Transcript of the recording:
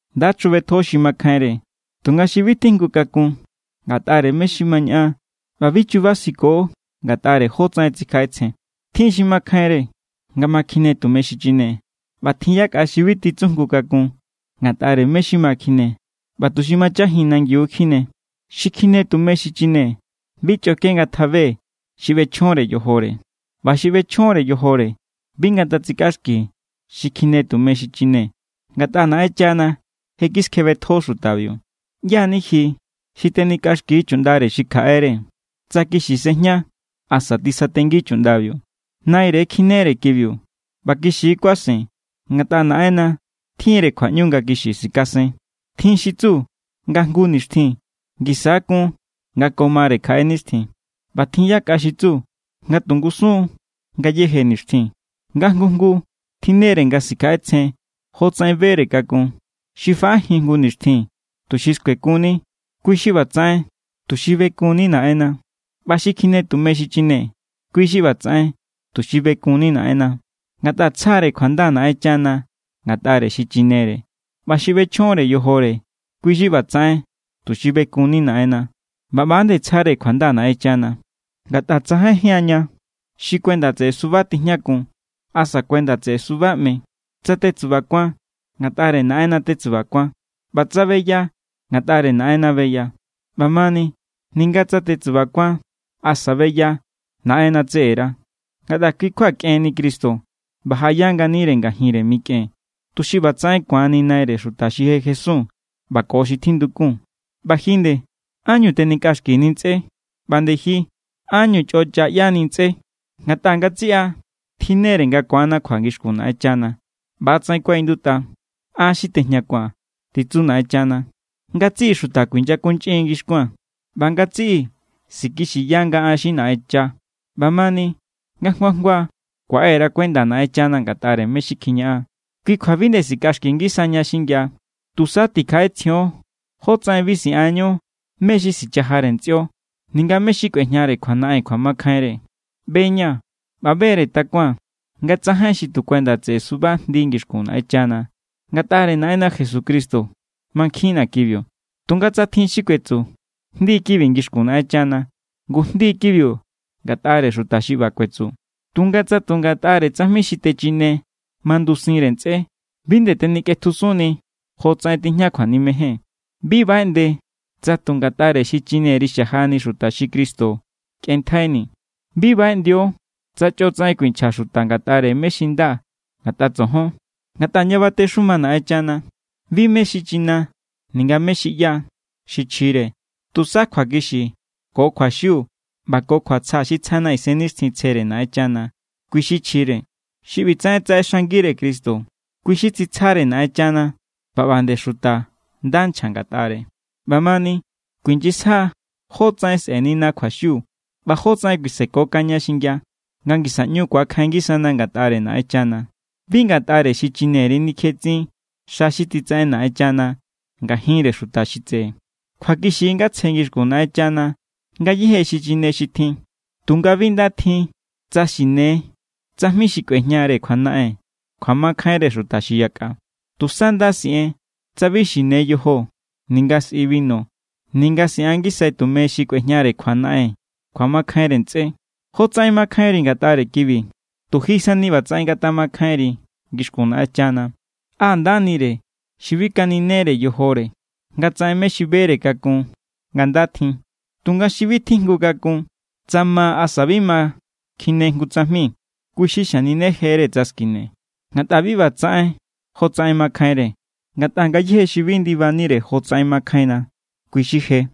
Nda chjubetjo xi makjainre tunga xi bi tjijngu kakun ngatꞌare mé= xi ma ñaꞌan ꞌba bi chubasiko ngatꞌare jotsaꞌen tsikjaꞌetsjen. Tjin xi makjainre nga ma kjine tume xichine, ꞌba tjin yakꞌa xi bi titsujngu kakun ngatꞌare mé= xi ma kjine ꞌba tu̱ xi machajin nangiu= kjine. Xi kjine tume xichine bi chꞌoke ngatjabe xi ꞌbechjonre yojore. ꞌBa xi ꞌbechjonre yojore bi ngatsikꞌaxki xi kjine tume xichine, ngatꞌa Naꞌenchana je kiskjebetjo xutabiu. ¿ꞌYá= ni ji xi tenikꞌaxki chuꞌndare xi kjaꞌere? Tsa kixi sejña asa tisatengi chuꞌndabiu, naire kjinere kibiu. ꞌBa kixi= kuasen, ngatꞌa Naꞌenna tjinre kjuaꞌñu nga kixi sikasen. Tjin xi tsu nga jngu nixtjin ngisa= kun nga ko mare kjaꞌe nixtjin, ꞌba tjin yakꞌa xi tsu nga tu ngusun= ngayéje nixtjin. Nga jngu jngu tjinnere nga sikjaꞌetsjen jotsaꞌen bere kakun. Xi faꞌajin jngu nixtjin tuxi skuekunni, kui= xi ꞌbatsaꞌen tuxi bekunni Naꞌenna. ꞌBa xi kjine tume xichine, kui= xi ꞌbatsaꞌen tuxi bekunni Naꞌenna, ngatꞌa tsjare kjuanda Naꞌenchana ngatꞌare xichinere. ꞌBa xi ꞌbechjonre yojore, kui= xi ꞌbatsaꞌen tuxi bekunni Naꞌenna, ꞌba ꞌba=nde tsjare kjuanda Naꞌenchana. Ngatꞌa tsajainjían ña xi kuenda tseꞌe suba tijñakun asa tsa kuenda tseꞌe suba ꞌme. Tsa tetsubakuan, ngatꞌare Naꞌenna tetsubakuan. ꞌBa tsa beya, ngatꞌare Naꞌenna beya. ꞌBamani ninga tsa tetsubakuan asa beya, Naꞌenna tseꞌera. Ngatꞌa kui= kjua kꞌenni Cristo ꞌba jaꞌaya nganire ngajinre mikꞌen, tuxi ꞌbatsaꞌen ku̱anni Naire xuta xi je jesun ꞌba ko xi tjindukun. ꞌBa ji nde, ¿ánñu tenikꞌaxkini ntsꞌé? ꞌBa nde ji, ¿ánñu chꞌocha ꞌyani ntsꞌé? Ngatꞌa ngatsiꞌa tjinnere nga ku̱anna kjua ngixkun Naꞌenchana. ꞌBa=tsaꞌen kuaꞌindutꞌa: “An= xi tejñakua̱n, titsu Naꞌenchana. Ngatsiꞌi xuta kuinyakunchꞌin ngi xkuaa̱n ꞌba ngatsiꞌi sikixiya nga an= xi Naꞌencha.” ꞌBamani nga jngu jngua kuaꞌe_ra kuenda Naꞌenchana ngatꞌare mé= xi kjiñaꞌan. Kui kjua bi nde sikꞌaxki ngisaña xingia. Tusa tikjaꞌetsjion jotsaꞌen bi siꞌanñu mé= xi sichajare ntsꞌio ninga mé= xi kꞌuejñare kjuanaꞌen kjuamakjainre. ꞌBe=ña̱ ꞌba be=re takuaa̱n nga tsajain xi tu kuenda tseꞌe suba jndi ngixkun Naꞌenchana. Ngatꞌare Naꞌenna Jesucristo mankjinna kibiu. Tunga tsa tjin xi kuetsu: “Jndi kibi ngixkun Naꞌenchana”, ngu jndi= kibiu ngatꞌare xuta xi ꞌba kuetsu. Tunga tsa tu ngatꞌare tsajmi xi techine mandusinre ntsꞌé, bi nde tenikꞌetjusunni jotsaꞌen tijña kjuanimejen. Bi baꞌeꞌnde tsa tu ngatꞌare xichineri xajani xuta xi Cristo kꞌenntjaini. Bi baꞌeꞌndio tsa chꞌo tsaꞌen kuinchja xuta ngatꞌare mé= xi nda ngatꞌa tsojon. Ngatꞌa ña batexuma Naꞌenchana, bi mé= xi china ninga mé= xi ꞌyá= xi chjire. Tusa kjuakixi ko kjuaxiu ꞌba ko kjuatsja xi tsjana Isennixtjinre Naꞌenchana, kui= xi chjire. Xi ꞌbitsaꞌen tsaꞌexangire Cristo, kui= xi tsitsjare Naꞌenchana ꞌba ꞌba nde xuta nda nchja ngatꞌare. ꞌBamani kuinyisja jótsaꞌen sꞌe̱nina kjuaxiu ꞌba jótsaꞌen kuisekokaña xingia nga ngisa ꞌñu ku̱akjain ngisana ngatꞌare Naꞌenchana. Bi ngatꞌare xichineri nikjetsin xa xi titsaꞌen Naꞌenchana ngajinre xuta xi tseꞌe. Kjuakixi= nga tsje ngixkun Naꞌenchana ngayéje xichine xi tjin, tunga bi nda tjin tsa xine tsajmi xi kꞌuejñare kjuanaꞌen kjuamakjainre xuta xi yakꞌa. Tusa nda siꞌen tsa bi xine yojo ninga sꞌi binu ninga siꞌan ngisai tumeñu xi kꞌuejñare kjuanaꞌen kjuamakjainre ntsꞌé. Jotsaꞌen mankjainri ngatꞌare kibi, tu ji sani ꞌbatsaꞌen ngatjamakjainri ngixkun Naꞌenchana. ¡Á ndanire xi bi kaninejere yojore nga tsaꞌen mé= xi bere kakun nga nda tjin! Tunga xi bi tjijngu kakun tsa ma asa bi ma kjine jngu tsajmi, kui= xi xaninejere tsa skine, ngatꞌa bi ꞌba titsaꞌen jotsaꞌen makjainre. Ngatꞌa ngayéje xi bi ndibanire jotsaꞌen makjainna, kui= xi je.